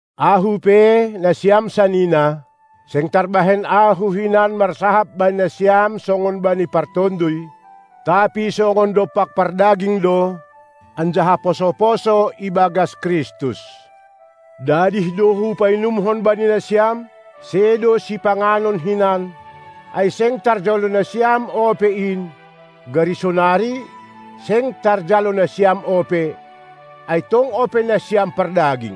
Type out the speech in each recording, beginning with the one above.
Ahu pe, nasiam sanina, seng tarbahen ahu hinan marsahap bani nasiam songon bani partonduy, tapi songon dompak pardaging do, anjaha poso-poso ibagas Kristus. Dadih do hupainumkon bani nasiam, sedo sipanganon hinan, ai seng tarjalo nasiam ope in; gari sonari, seng tarjalo nasiam ope, ai tong ope nasiam pardaging.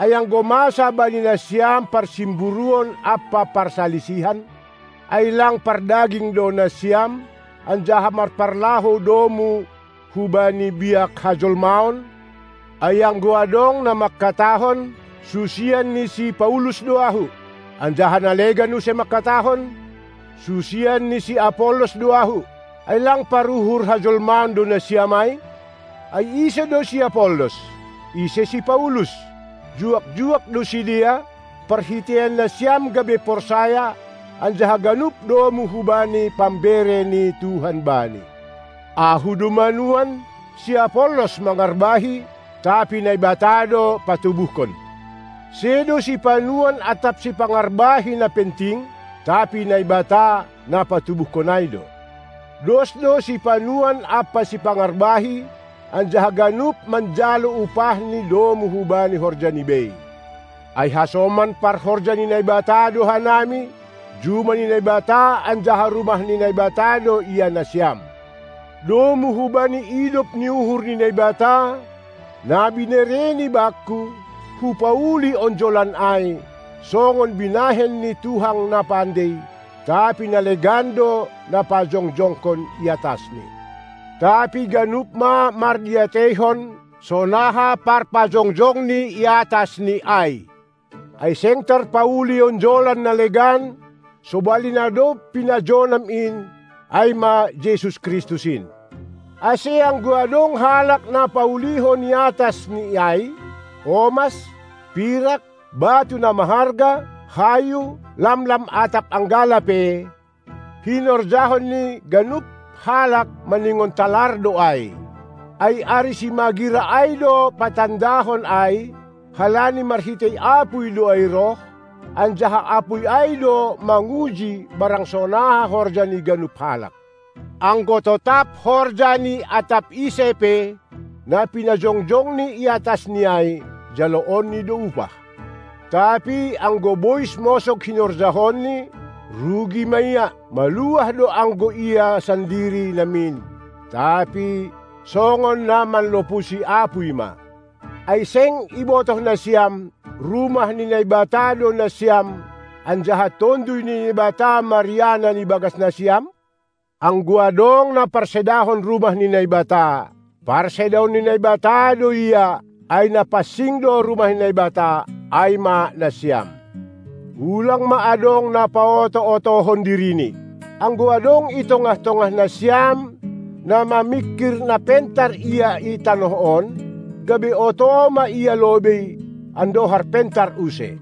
Ai anggo masa bani nasiam parsimburuon ampa parsalisihan, ai lang pardaging do nasiam, anjaha marparlahou domu hubani biak hajolmaon? Ai anggo adong na mangkatahon: "Susian ni si Paulus do ahu", anjaha na legan use mangkatahon, "Susian ni si Apollos do ahu", ai lang paruhur hajolmaon do nasiam ai? Ai ise do si Apollos? Ise si Paulus? Juak-juak do sidea, parhiteian nasiam gabe porsaya, anjaha ganup domu hubani pambere ni Tuhan bani. Ahu do manuan, si Apollos mangarbahi, tapi Naibata do patubuhkon. Sedo sipanuan atap sipangarbahi na penting, tapi Naibata, na patubuhkon ai do. Dos do sipanuan ampa sipangarbahi, anjaha ganup manjalo upahni domu hubani horjani bei. Ai hasoman parhorja ni Naibata do hanami; juma ni Naibata anjaha rumah ni Naibata do ia nasiam. Domu hubani idop ni uhur ni Naibata, na binereNi bakku, hupauli onjolan ai, songon binahen ni tukang na pandei; tapi na legan do na pajongjongkon i atasni. Tapi ganup ma mardiateihon, sonaha parpajongjongni i atas ni ai. Ai seng tarpauli onjolan na legan, sobali na dob pinajonam in, ai ma Jesus Kristus in. Ase anggo adong halak na paulihon i atas ni ai, omas, pirak, batu na maharga, hayu, lamlam atap anggala pe, hinorjahon ni ganup halak maningon talar do ai. Ai ari simagira ai do patandahon ai, halani marhitei apuy do ai roh, anjaha apuy ai do manguji barang sonaha horja ni ganup halak. Anggo totap horja ni atap ise pe, na pinajongjongni iatas ni ai, jaloonni do upah. Tapi anggo bois mosog hinorjahonni, rugi ma ia; maluah do anggo ia sandiri namin, tapi songon na manlopusi apuy ma. Ai seng ibotoh nasiam, rumah ni Naibata do nasiam anjaha Tonduy ni Naibata marianan ibagas nasiam? Anggo adong na parsedahon rumah ni Naibata, parsedaon ni Naibata do ia, ai na pansing do rumah ni Naibata, ai ma nasiam. Ulang ma adong na paoto-otohon dirini. Anggo adong i tongah-tongah nasiam na mamingkir na pentar ia i tanoh on, gabe oto ma ia lobei, andohar pentar use.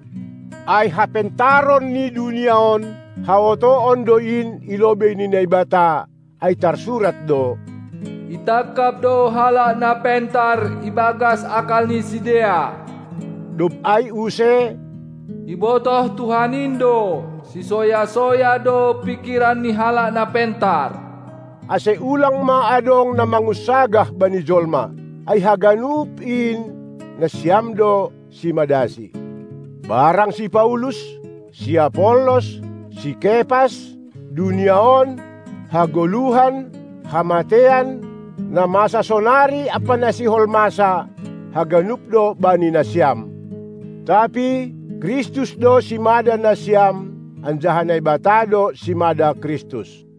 Ai hapentaron ni dunia on, haotoon do in i lobei ni Naibata, ai tarsurat do: Itangkap do halak na pentar ibagas akal ni sidea. Dob ai use: Ibotoh Tuhan in do, sisoya-soya do pingkiran ni halak na pentar. Ase ulang ma adong na mangunsagah bani jolma. Ai haganup in nasiam do simadasi, barang si Paulus, si Apollos, si Kepas, dunia on, hagoluhan, hamateian, na masa sonari ampa na sihol masa, haganup do bani nasiam, tapi Kristus do simada nasiam anjaha Naibata do simada Kristus.